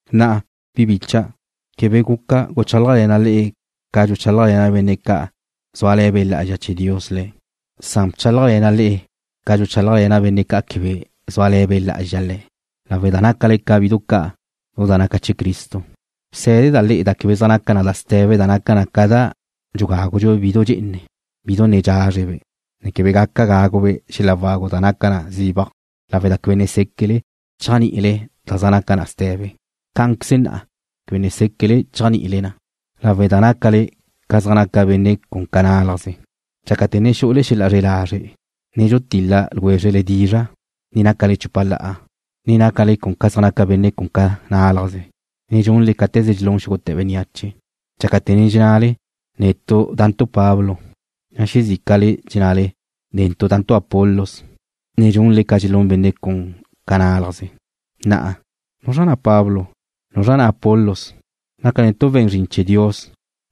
Na'a, le'e, bi bícha'dau', quebe guca guchálajle̱na' le'e ca dxuchálajle̱na' benne' ca' zúale̱ Be' Lá'azxa chee̱ Dios le̱', san bchálajle̱na' le'e ca dxuchálajle̱na' benne' ca' quebe zúale̱ Be' Lá'azxa le̱', lawe' da ne nácale ca bidu ca' lu da naca chee̱ Cristo. Bsé̱deda' le'e da quebe zaj naca na ste̱be da naca na ca da dxugágudxu bidu dxe'ene, bidu ne dxázrebe', ne quebe gaca gágube' xel-la wagu da naca na zibaj, lawe' da quebe ne séquele chéajni'ile da zaj naca na ste̱be. Cá'anqueze na'a quebe ne séquele chéajni'ile na lawe' da ne nácale ca zaj naca benne' cun ca nalaje̱'. Dxácate̱ ne xu'ule xel-la zre lazre', ne dxutil-la ljwézrele dizra' ne nácale chupa la'a, ne nácale ca zaj naca benne' cun ca nálaje̱', ne dxunle cáte̱ze dxelún xúgute̱ bénneache. Dxácate̱ ne dxennale: Netu' da'ntu' Pablo, na' xezícale dxennale: Netu' da'ntu' Apolos, ne dxunle ca dxelún benne' cun ca nálajze̱'. Na'a, ¿nuzra na' Pablo? ¿Nuzra na' Apolos? Nácantu' we̱n zrin chee̱ Dios,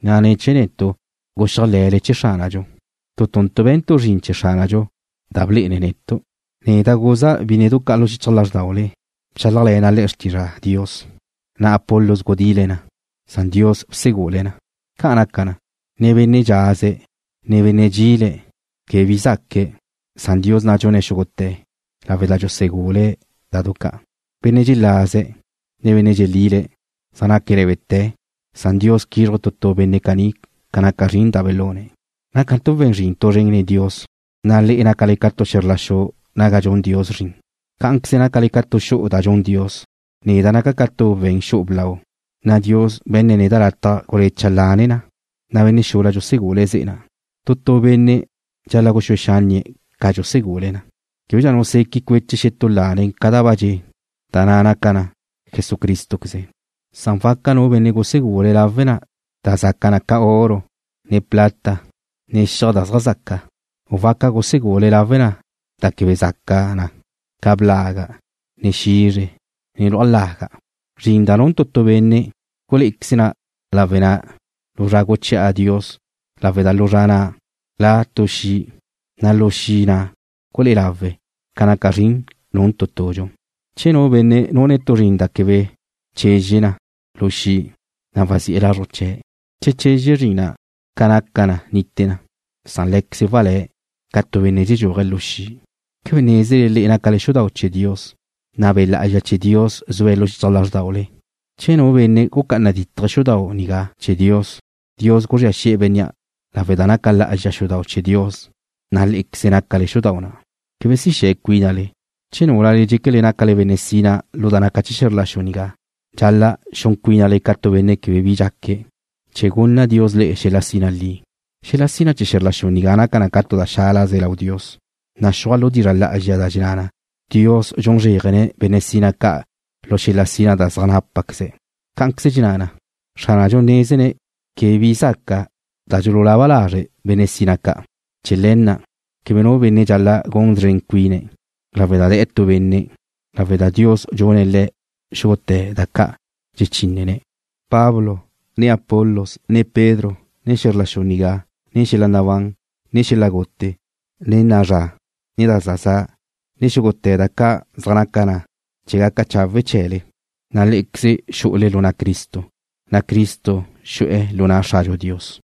na' ne̱ chee̱ netu' guxéajle̱le chee̱ Xránadxu. Tu tuntu' be̱ntu' zrin chee̱ Xránadxu da blé'ene̱' netu'. Neda' guza' bínnedu ca' lu xichaj lázrdaule, bchálajle̱na' le'e xrtizra Dios, na' Apolos gudile̱' na, san Dios bsegule̱' na. Ca' naca na, ne benne' dxaze̱', ne benne' dxile̱' na, quebe bi zaque̱', san Dios na' dxune̱' xúgute̱, lawe' da dxusegule̱' da du ca'. Benne' dxelaze̱', ne benne' dxelile̱' zaj naque̱' lé̱bete̱, san Dios quízruje̱' tu tu benne' caní ca naca zrin da belune̱'. Nácantu' we̱n zrin tu zren nen Dios, na' le'e nácale ca tu xe̱zr la xu naga dxun Dios zrin. Cá'anqueze nácale ca tu xu'u da dxun Dios. Neda' naca' ca tu we̱n xu'u blau, na' Dios be̱nne̱' neda' lataj gulecha' lane na, na' benne' xula dxusegule̱' ze'e na'. Tu tu benne' dxal-la' guxúe xánnie̱' ca dxusegule̱' na. Québedxa nu seque' cueche̱' xetú lane ca da ba dxe', da na' naca na Jesucrístoqueze, san waca nu benne' gusegule̱' lawe' na da zaca na ca oro, ne plata, ne xiaj da zaj zaca, u waca gusegule̱' lawe' na da quebe zaca na ca blaga', ne xizre, ne luaj laga'. Zrin da nun tu tu benne' gulé'equeze lawe na lu zra guchi'a Dios, lawe' da lu zra na' la' tu xi', na' lu xi' na' gulé'e lawe na ca naca zrin nun tu tudxu. Che nu benne' nune̱' tu zrin da quebe chezxe na lu xi', na' wazi'e̱ lazruj chee̱'. Che chezxe zrin na', ca naca na nite na, san lé̱queze̱' walé̱', ca tu benne' dxexedxúaje̱' lu xi'. ¿Quebe nézele le'e nácale xudau' chee̱ Dios, na' Be' Lá'azxa chee̱ Dios zue̱' lu xichaj lázrdaule? Che nu benne' gucá'ana dítaje̱' xudau' nigá chee̱ Dios, Dios guzría xi'e̱ bénnea' lawe' da naca lá'azxa xudau' chee̱ Dios, na' lé'equezle nácale xudau' na'. Quebe si xe̱ cuínale. Che núlale dxéquele nácale benne' sina lu da naca chee̱ xe̱zr la xu nigá, dxal-la' xun cuínale ca tu benne' quebe bi dxaque̱', chee̱ gunna Dios le'e xel-la sina li. Xel-la sina chee̱ xe̱zr la xu nigá naca na tu da xálaze lau Dios. Naxúaj lu dizra' lá'azxa da dxenná na: Dios dxun zréajane̱' benne' sina ca' lu xel-la sina da zaj nápaqueze̱'. Cá'anqueze dxenná na: Xránadxu nézene̱' quebe bi zaca da dxululaba lazre' benne' sina ca'. Chee̱ le̱ na' quebe nu benne' dxal-la' gun szren cuine̱' lawe' da de̱'e̱ tu benne', lawe' da Dios dxunne̱' le'e xúgute̱ da ca' dxechínnele. Pablo, ne Apolos, ne Pedro, ne xe̱zr la xu nigá, ne xel-la nabán, ne xel-la gute, ne na'a zra, ne da za za', ne xúgute̱ da ca' zaj naca na chee̱ gaca da chawe' chee̱le, na' lé'equezle xu'ule lu na' Cristo, na' Cristo xu'e̱ lu na' Xradxu Dios.